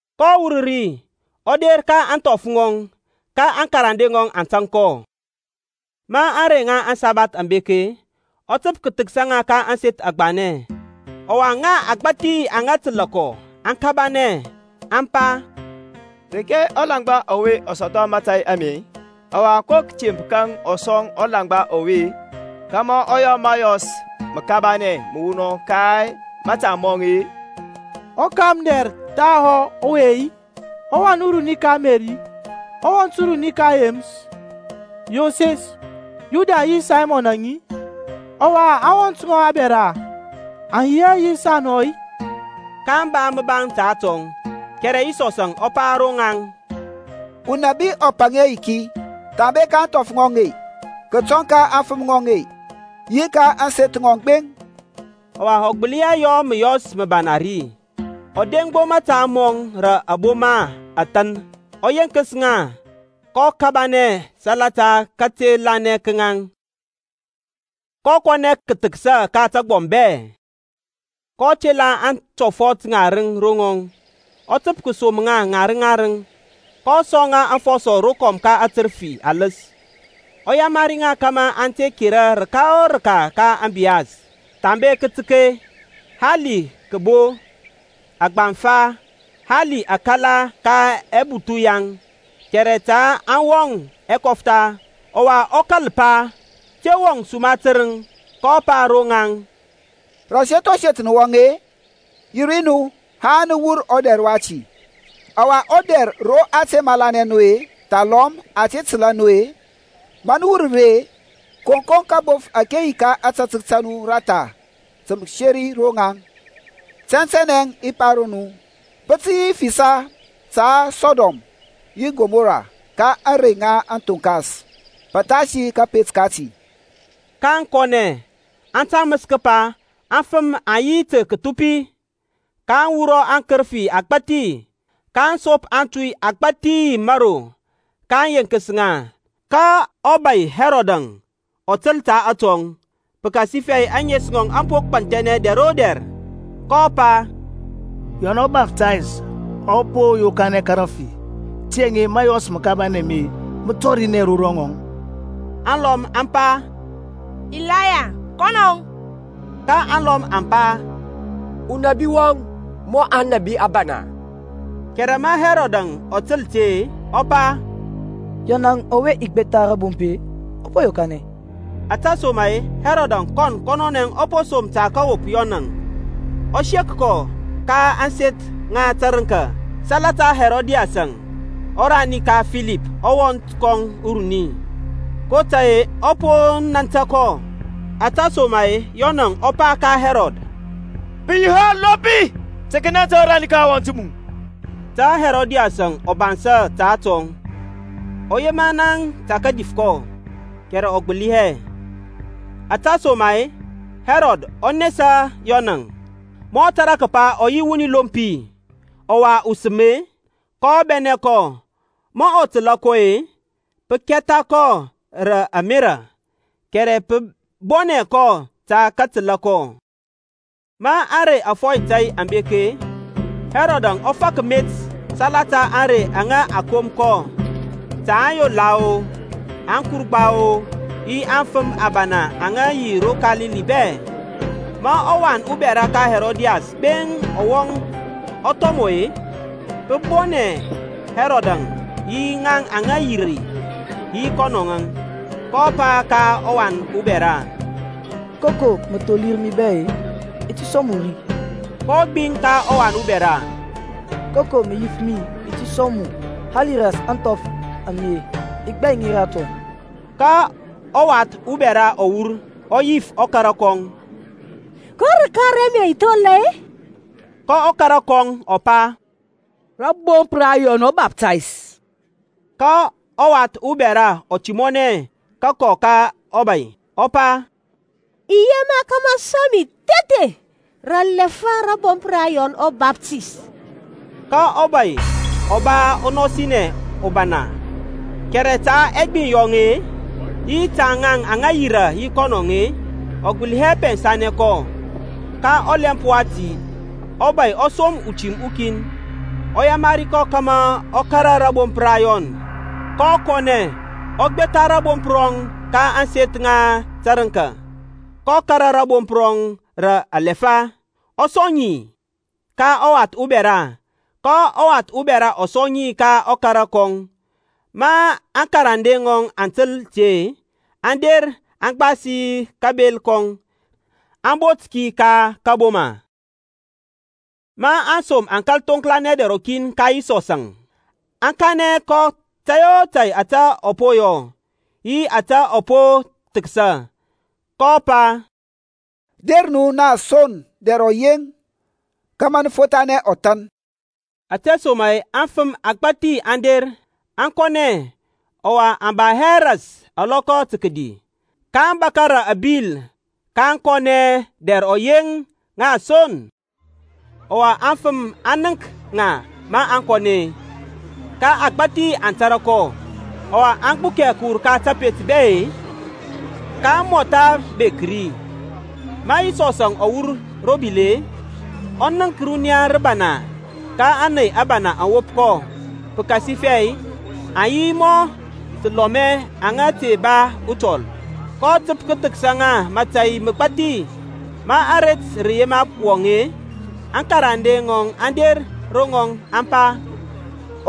kɔ wur ri, ɔ der ka ȧŋthɔf ŋɔŋ, ka aŋkarande ŋɔŋ aŋ tȧŋ kɔ. Ma ȧŋrey ŋa aŋsabath aŋ bek-e, ɔ təp kəthəksa ka ȧŋseth agbanɛ. Ɔwa ŋa agbȧthi aŋa təlȧ kɔ aŋ kabanɛ, aŋ pa, Reke ɔlaŋgba ɔwe ɔ sɔthɔ mȧtȧy ame-e? Ɔwa ko kətemp kaŋ a sɔŋ ɔlaŋgba ɔwe-e, kȧmȧ ɔ yɔ məyɔs məbana məwunɔŋ ka mȧta mɔŋ-e? Ɔkamdɛr thahɔ ɔwe-i? Ɔwan uruni ka Meri, ɔwɔnt uruni ka Yeməs, Yoses, Yuda yi Saymɔnȧŋ-i? Ɔwa aŋwɔnt ŋɔŋ abɛra aŋ yi hɛ sɔ nɔ yi saŋ-i? kaŋ ba məbaŋ ta atɔŋ Kɛrɛ Yisɔs ɔ pa ro ŋaŋ, Unabi ɔ paŋ hɛ yiki, thambe ka ȧŋthɔf ŋɔŋ, kətɔŋ ka aŋfəm ŋɔŋ, yi ka ȧŋseth ŋɔŋ gbeŋ. Ɔwa ɔ gbəli hɛ yɔ məyɔs məbana ri, ɔ deŋ gbo mȧta mɔŋ rə aboma athȧn, ɔ yenkəs ŋa. kɔ kabanɛ salata kate lanɛ ka ŋaŋ. Kɔ kɔnɛ kəthəksa ka tagbɔm bɛ. kɔ tela aŋtɔfɔt ŋarəŋ ro ŋɔŋ, ɔ təp kəsom ŋa ŋarəŋ ŋarəŋ, kɔ sɔŋ ŋa afɔsɔ rokɔm ka aŋkərəfi aləs. Ɔ yamari ŋa kȧmȧ aŋ te kera rəka o rəka ka ȧŋbiyas, thambe kətək, hali kəbo, agbaŋfa, hali akala ka ɛbuthu yaŋ. Kɛrɛ ta aŋ wɔŋ ɛkɔftha, ɔwa ɔ kȧl pa, Te wɔŋ suma tərəŋ. kɔ pa ro ŋaŋ, Rə aseth o seth nə wɔŋ-e, yi ri nu haŋ nə wur ɔdɛr wati. Ɔwa dɛr ro a te malanɛ nu-e thalɔm a te təlȧ nu-e, ma nə wur ri-e, koŋkoŋ kabof ȧke yi ka ȧtȧtək ta nu ratha tə kəseri ro ŋaŋ. Tɛntɛnɛ i pa ro nu, Pə tə yi fisa ta Sɔdɔm yi Kɔmɔra ka ȧŋrey ŋa kathoŋkas pəthasi kȧpet kati. kaŋ kɔnɛ, aŋ taməs kəpa afəm aŋ yi tə kəthupi. kaŋ wurɔ akərəfi agbȧthi, kaŋ sop atuy agbȧthi mȧro, kaŋ yenkəs ŋa. Ka ɔbȧy Hɛrɔdȧŋ ɔ təl ta atɔŋ, pəkasifɛ ȧŋes ŋɔŋ aŋ po gbanthɛnɛ dɛr o dɛr, kɔ pa, Yɔn ɔBaftays ɔ po yokanɛ ka rafi. Tiyȧŋ mȧyɔs məkabanɛ ame mə tɔrinɛ ro ŋɔŋ. Alɔm aŋ pa, Ilaya, kɔnɔŋ. Ka aŋlɔm aŋ pa, Unabi wɔŋ mɔ aŋnabi abana. Kɛrɛ ma Hɛrɔdȧŋ ɔ təl ti-e ɔ pa, Yɔnȧŋ ɔwe i gbetha rabomp-e, ɔ po yokanɛ. Ȧtesoma-e Hɛrɔdȧŋ kɔn kɔnɔnɛ ɔ po som tə kəwop Yɔnȧŋ, ɔ sek kɔ ka ȧŋseth ŋa tərəŋka salata Herodias, ɔrani ka Filip ɔwɔnt kɔŋ uruni, kotȧy-e ɔ po nȧntȧ kɔ. Ȧtesoma-e Yɔnȧŋ ɔ pa ka Hɛrɔd, Pə yi hɛ ɔlompi tə kənanta ɔrani ka ɔwɔnt mu. Tə Herodias ɔ bansȧ ta atɔŋ, ɔ yema naŋ tə kədif kɔ, kɛrɛ ɔ gbəli hɛ. Ȧtesoma-e Hɛrɔd ɔ nesa Yɔnȧŋ, ma ɔ tȧrȧ kəpa ɔ yi wuni lompi, ɔwa usəm-e. Kɔ bɛnɛ kɔ. Ma ɔ təlȧ kɔ-e, pə kɛtha kɔ rə ȧmerȧ, kɛrɛ pə bɔnɛ kɔ tə kətəla kɔ. Ma ȧrey ȧfɔy tȧy aŋ bek-e, Hɛrɔdȧŋ ɔ fak met salata ȧŋrey aŋa a kom kɔ ta aŋyola-o, aŋkurgba-o, yi aŋfəm abana ŋa ro Kalili bɛ. Ma ɔwan ubɛra ka Herodias gbeŋ ɔ wɔŋ ɔ thɔmɔ-e, pə bɔnɛ Herodȧŋ yi ŋaŋ aŋa yirȧ yi kɔnɔŋ-e. Kɔ pa ka ɔwan ubɛra, Koko mə tholir mi bɛ-e i ti sɔŋ mu ri. kɔ gbiŋ ka ɔwan ubɛra, Koko mə yif mi i ti sɔŋ mu, hali ras ȧŋthɔf a mi-e, i gbai ŋi ratɔŋ. Ka ɔwath ubɛra ɔ wur, ɔ yif ɔkara kɔŋ, Ko rəka raŋ mə i thola-e? Ka ɔkara kɔŋ ɔ pa, Rȧbomp ra Yɔn ɔBaftays. Ka ɔwath ubɛra ɔ timɔnɛ kəkɔ ka ɔbay-e, ɔ pa, I yema kȧmȧ mə sɔŋ mi thethe rə alɛfa rȧbomp ra Yɔn ɔBaftays. Ka ɔbȧy ɔ ba ɔnɔsinɛ ɔbana, kɛrɛ ta ɛgbiŋ yɔŋ-e, yi ta ŋaŋ aŋa yirȧ yi kɔnɔ-e, ɔ gbəli hɛ pɛnsanɛ kɔ. Ka ɔlɛmp wati ɔbȧy ɔ som utim ukin, ɔ yamari kɔ kȧmȧ ɔ kȧrȧ rȧbomp rɔŋ; kɔ kɔnɛ, ɔ gbetha rȧbomp rɔŋ ka ȧŋseth ŋa tərəŋka, kɔ kȧrȧ rȧbomp rɔŋ rə alɛfa, ɔ sɔŋ ŋi ka ɔwath ubɛra, ka ɔwath ubɛra ɔ sɔŋ ŋi ka ɔkara kɔŋ. Ma aŋkarande ŋɔŋ aŋ təl ti-e, aŋ der aŋ gbasi kabel kɔŋ, aŋ bot ki ka kȧboma. Ma aŋsom aŋ kȧl thoŋklanɛ dɛr rɔkin ka Yisɔsȧŋ, aŋ kanɛ kɔ tȧy o tȧy ȧte aŋ po yɔ, yi ȧte aŋ po thəksa. kɔ pa, Der nu na son rə dɛr ɔyeŋ, kȧmȧ nə fothanɛ ɔthan. Ȧtesoma-e afəm agbȧthi aŋ der, aŋ kɔnɛ, ɔwa aŋ ba hɛ ras alɔkɔ tə kədi. kaŋ bȧkȧ rə abil kaŋ kɔnɛ dɛr ɔyeŋ ŋa son. Ɔwa aŋfəm aŋ nənk ŋa maŋ kɔnɛ-e, ka agbȧthi aŋ tȧrȧ kɔ, ɔwa aŋ gbukɛ kəwur ka tapet bɛ-e, kaŋ mɔtha bek ri. Ma Yisɔsȧŋ ɔ wur ro bil-e, ɔ nənk runiya rəbana ka ȧney abana aŋ wop kɔ, pəkasifɛ aŋ yi mɔ təlɔmɛ aŋa te ba utɔl, kɔ təp kəthəksa ŋa mȧtȧy məgbathi. Ma aret rə yema wɔŋ-e, aŋkarande ŋɔŋ aŋ der ro ŋɔŋ, aŋ pa,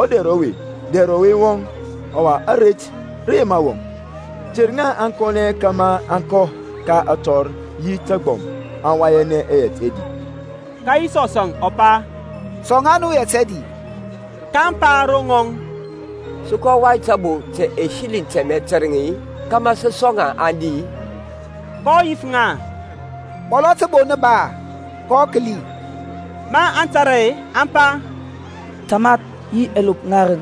Ɔdɛr ɔwe-e, dɛr ɔyeŋ wɔŋ, ɔwa aret rə yema wɔŋ. Ter ŋa aŋ kɔnɛ kȧmȧ aŋ kɔ ka atɔr yi ka tagbɔm, aŋ wayanɛ yɛt ɛdi. Ka Yisɔsȧŋ ɔ pa, Sɔŋ ŋa nu yɛt ɛdi. Kaŋ pa ro ŋɔŋ, Sə kɔ wai təbo ta ɛsiliŋ tɛmɛ tərəŋ-i kȧmȧ sə sɔŋ ŋa aŋ di-i? kɔ yif ŋa, Mɔlɔ təbo nə ba-a? Kɔ kəli. Ma aŋ tara-e, aŋ pa, Tamath, yi ɛlop ŋarəŋ.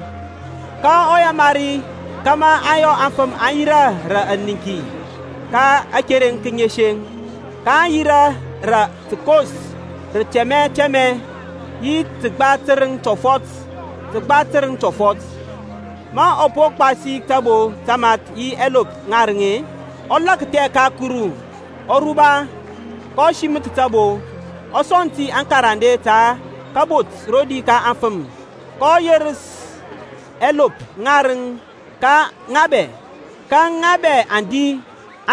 kɔ yamari ŋa kȧmȧ aŋ yɔ aŋfəm aŋ yirȧ rə ɛniŋki ka akereŋ kəŋeseŋ. kaŋ yirȧ rə təkos rə tɛmɛ tɛmɛ yi rə təgba tərəŋ tɔfɔt təgba tərəŋ tɔfɔt. Ma ɔ po gbasi tabo tamath yi ɛlop ŋarəŋ-e, ɔ lakthɛ ka Kuru, ɔ ruba, kɔ siməth tabo, ɔ sɔŋ ti aŋkarande tə kəbot rodi ka aŋfəm. Kɔ yerəs ɛlop ŋarəŋ ka ŋa bɛ. Ka ŋa bɛ aŋ di,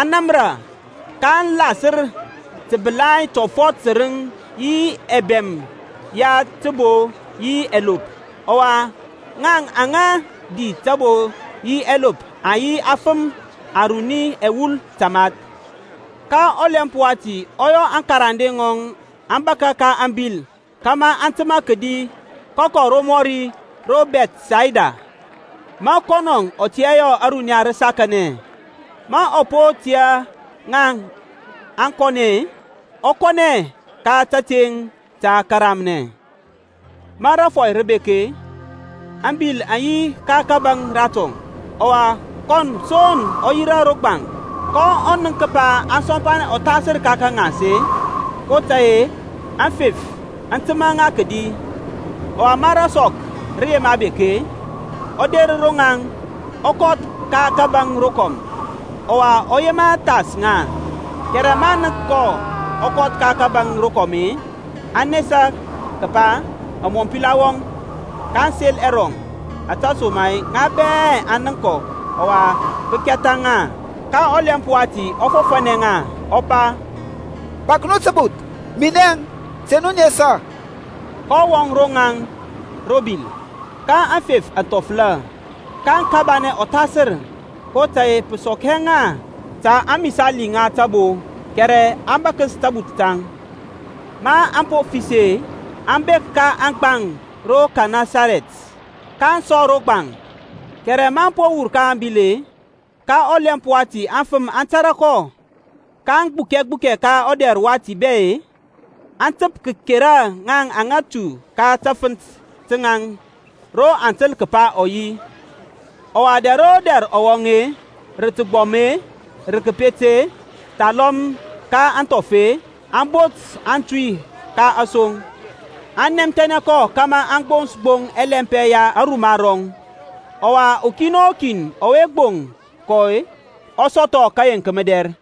aŋ namra. kaŋ lasər təbəlai tɔfɔt tərəŋ yi ɛbɛm ya tabo yi ɛlopȧŋ. Ɔwa ŋa aŋa di tabo yi ɛlopȧŋ aŋ yi afəm aruni ɛwul tamath. Ka ɔlɛmp wati ɔ yɔ aŋkarande ŋɔŋ aŋ bȧkȧ ka ȧŋbil kȧmȧ aŋ təmȧ kədi kəkɔ romɔri ro Bɛthsayda, ma kɔnɔ ɔ tiyȧ yɔ ȧruniya rə sakanɛ. Ma ɔ po tiyȧ ŋa aŋ kɔnɛ-e, ɔ kɔnɛ ka kateŋ tə kəramnɛ. Ma rȧfɔy rə bek-e, ȧŋbil aŋ yi ka kȧbȧŋ ratɔŋ, ɔwa kɔn son ɔ yi ro gbaŋ. kɔ nənk kəpa aŋ sɔmpanɛ ɔthasər ka kəŋas-e, kotȧy-e aŋfef aŋ təmȧ ŋa rodi. Ɔwa ma rasɔk rə yema bek-e, ɔ der ro ŋaŋ, ɔ kɔth ka kȧbȧŋ rokɔm, ɔwa ɔ yema thas ŋa. Kɛrɛ maŋ nənk ɔ kɔth ka kȧbȧŋ rokɔm-e, aŋ nanɛ kəpa amɔmpila wɔŋ, kaŋ sel ɛrɔŋ, ȧtesoma-e ŋa bɛ aŋ nənk kɔ ɔwa pə kɛtha ŋa. Ka ɔlɛmp wati ɔ fɔfȧnɛ ŋa, ɔ pa, Bȧk nu təbuth, minɛŋ; te nu nesa. kɔ wɔŋ ro ŋaŋ ro bil, ka aŋfef aŋ thɔfəla, kaŋ kabanɛ ɔthasər, kotȧy-e pə sɔk hɛ ŋa ta amisali ŋa tabo kɛrɛ a bȧkəs tabuth taŋ. Maŋ po fəsi-e, aŋ bek ka aŋgbaŋ ro Kɛnɛsarɛt-e, kaŋ sɔ ro gbaŋ. Kɛrɛ maŋ po wur ka ȧŋbil-e, ka ɔlɛmp wati aŋfəm aŋ tȧrȧ kɔ, kaŋ gbukɛ gbukɛ ka ɔdɛr wati bɛ-e, aŋ təp kəkera ŋaŋ aŋa tu ka tafənt taŋ ro aŋ təl kəpa ɔ yi. Ɔwa dɛr o dɛr ro ɔ wɔŋ-e, rə təgbɔm-e, rə təpet-e, thalɔm ka aŋthɔf-e, aŋ bot aŋtui ka asoŋ, aŋ nɛmthɛnɛ kɔ kȧmȧ aŋ gbons gbo ɛlɛmpɛ ya aruma rɔŋ. Ɔwa ukin o kin ɔwe gboŋ kɔ ɔ sɔthɔ kəyeŋk mədɛr.